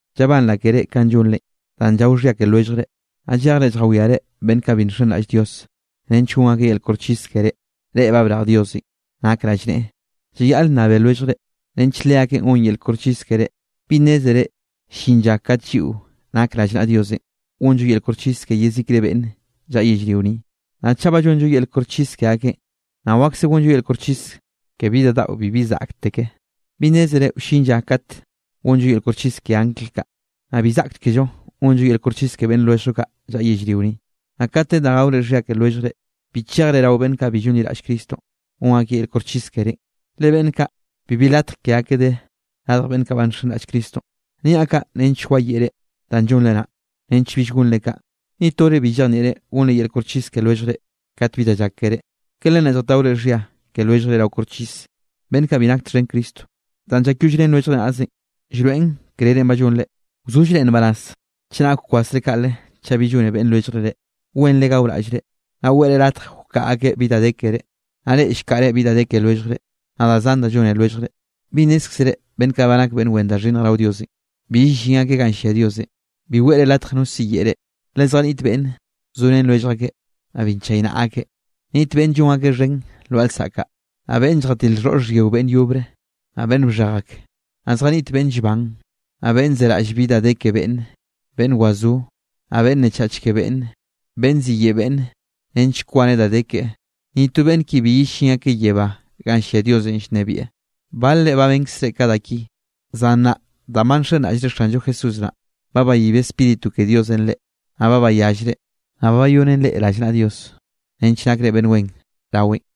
Llabanraꞌ keré kanꞌ llonrenꞌ danꞌ llao xhia ke lwelljre, naꞌ llejre lljawiare beꞌnn kaꞌ bi nxenraꞌll Dios nench gon akeꞌ yel koxchis kerénꞌ. Reꞌ ba brej Diosenꞌ nak rallneꞌe, llayaꞌl nnabe lwelljre, nench leakeꞌ gon yel koxchis kerénꞌ. ¿Bi nnézere llin lla kate lliꞌo nak rallnaꞌa Diosenꞌ, gonllo yel koxchis ke yezikre beꞌnn llaꞌa yellrio ni? Naꞌ chaꞌ ba llonllo yel koxchis ke akeꞌn, naꞌ wakse gonllo yel koxchis ke bi da daꞌo bibi zaꞌkteke. ¿Bi nnézere wllin lla kat gonllo yel koxchis ke angl kaꞌ? ¿Naꞌ bi zaꞌkchkello gonllo yel koxchis ke beꞌnn lwelljllo kaꞌ llaꞌa yellrio ni? Naꞌ kat de da gaore xhia ke lwelljre, bi chejre rao beꞌnn kaꞌ bi llonliraꞌll Cristonꞌ gon akeꞌ yel koxchis kerénꞌ, le beꞌnn kaꞌ bibi latj ke akeꞌ de radj beꞌnn kaꞌ ba nxenraꞌll Cristonꞌ. Niaꞌ kaꞌ nench wayeꞌre danꞌ llonre naꞌ, nench bill gonre kaꞌ. ¿Ni tore bi llejnieꞌre gonre yel koxchis ke lwelljre kat bi da llak keré? ¿Ke len naꞌ lljataore xhia ke lwelljre rao koxchis, beꞌnn kaꞌ bi nak txhen Cristo? Danꞌ llakyollrén lwelljre naꞌzenꞌ, llroeꞌn krerenꞌ ba llonre. Wzollre nbaraz chenak llkwasre kaꞌle chaꞌ bi llone beꞌnn lwelljre reꞌ. Wenre gaoraꞌllre, naꞌ weꞌre latj wkaꞌa akeꞌ bi da de keré. Naꞌ reꞌ llkaꞌre bi da de ke lwelljre, naꞌ da zan da llone lwelljre. ¿Bi nnézkzere beꞌnn kaꞌ nak beꞌnn wen da xhinnj rao Diosenꞌ, bi yellín akeꞌ ganꞌ llia Diosenꞌ? Bi weꞌre latje no siyeꞌe reꞌ, le zjaniꞌt beꞌnn zorén lwellj akeꞌ, naꞌ bi nchaynaꞌa akeꞌ. Niꞌt beꞌnn llon akeꞌ xhen lwaꞌa lsaꞌk kaꞌ, naꞌ beꞌnn lljatil xhoꞌr xhyio beꞌnn yobre, naꞌ beꞌnn bxhej ak. Naꞌ zjaniꞌt beꞌnn llban, naꞌ beꞌnn zeraꞌll bi de ke beꞌnne, beꞌnn wazó, naꞌ beꞌnn nnechach ke beꞌnne, beꞌnn ziyeꞌe beꞌnn, nench kwaneꞌ da de keꞌe. Ni to beꞌnn ki bi yellín akeꞌ yebá ganꞌ llia Diosenꞌ llnebieꞌ. Balre ba benkzre ka da ki, zan nnaꞌ danꞌ ba nxenraꞌllre Xanllo Jesús naꞌ, ba bayib Spíritu ke Diosenꞌ reꞌ, naꞌ ba bayallre, naꞌ ba bayonen reꞌ rallnaꞌa Dios nench nakre beꞌnn wen raweꞌn.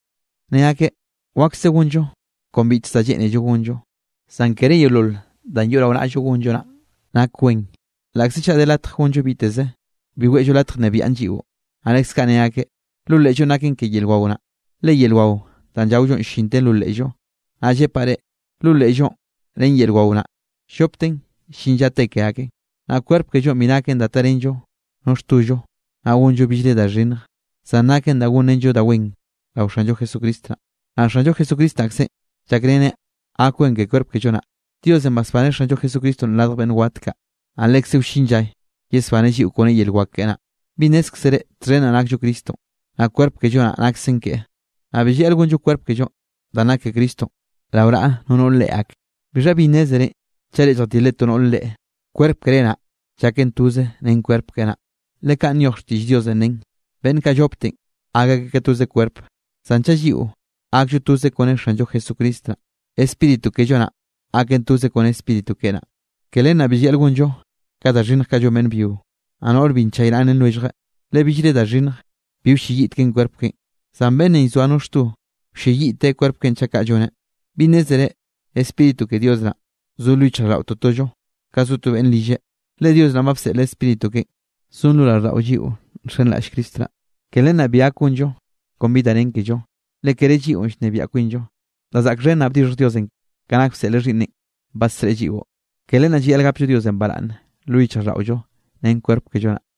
Ne akeꞌ: “Wakse gonllo kon biteze da lleꞌnello gonllo.” Zan kere yeolol danꞌ yoꞌ rao naꞌllo gonllo naꞌn nak wen. Laꞌkze chaꞌ de latj gonllo biteze, bi weꞌllo latje nnebiaꞌn lliꞌo. Naꞌ leskaꞌ ne akeꞌ: “Lo leꞌllonꞌ naken ke yel wao naꞌ, le yel wao danꞌ llaollonꞌ llinten lo leꞌllo.” Naꞌ llepaꞌ reꞌ, lo leꞌllonꞌ ren yel wao naꞌ, llopten llin lla te ke aken. Naꞌ kwerp kellonꞌ bi naken da tarenllo no xtollo, naꞌ gonllo billre da xhinnj, zan naken da gonrenllo da wen rao Xanllo Jesucristo naꞌ. Naꞌ Xanllo Jesucristo naꞌkzenꞌ llakreneꞌ gak wen ke kwerp kello naꞌ. Diosenꞌ basbaneꞌ Xanllo Jesucristonꞌ radj beꞌnn wat kaꞌ, naꞌ lekze wllin lla yesbaneꞌ lliꞌo kone yel wak keꞌe naꞌ. ¿Bi nnézkzere txhen naꞌ nakllo Cristonꞌ, naꞌ kwerp kello naꞌ naksen keꞌe? Naꞌ bi llayaꞌl gonllo kwerp kellonꞌ danꞌ nak ke Cristonꞌ, rao naꞌa no noꞌr reꞌe ak. ¿Bixha bi nnézerenꞌ chaꞌ reꞌ zjatilre to noꞌr reꞌe, kwerp keré naꞌ llaken toze ren kwerp keꞌe naꞌ? Le kaꞌn nyoj xtiꞌll Diosenꞌ nen: “Beꞌnn kaꞌ llopteꞌ gak akeꞌ toze kwerp.” Zan chaꞌ lliꞌo gakllo toze kone Xanllo Jesucristo naꞌ, spíritu kello naꞌ gaken toze kone Spíritu keꞌe naꞌ. Ke len naꞌ bi llayaꞌl gonllo ka da xhinnj kaꞌ llon beꞌnn byio, naꞌ noꞌr bi nchaynaꞌrén lwellje. Le billre da xhinnj bi wlleyiꞌteken kwerp keꞌen, zan beꞌnnenꞌ llzoa no xto, wlleyiꞌte kwerp keꞌen chaꞌ kaꞌ lloneꞌ. ¿Bi nnézere Spíritu ke Dios naꞌn zo lo yichjraꞌlldaꞌo totollo ka zo to beꞌnn rilleꞌ? Le Dios naꞌn ba bseꞌleꞌ Spíritu keꞌen, zon lo raꞌlldaꞌo lliꞌo nxenraꞌll Cristo naꞌ, ke len naꞌ bi gak gonllo kon bi da nen kello, le kere lliꞌo llnebiaꞌ kwinllo. Da zaꞌk xhen naꞌ bdixhj Diosenꞌ ka nak bseꞌleꞌ Xhiꞌnneꞌn badsreꞌe lliꞌo. Ke len naꞌ llayaꞌl gapllo Diosenꞌ baraꞌnne lo yichjraꞌlldaꞌollo ren kwerp kello naꞌ.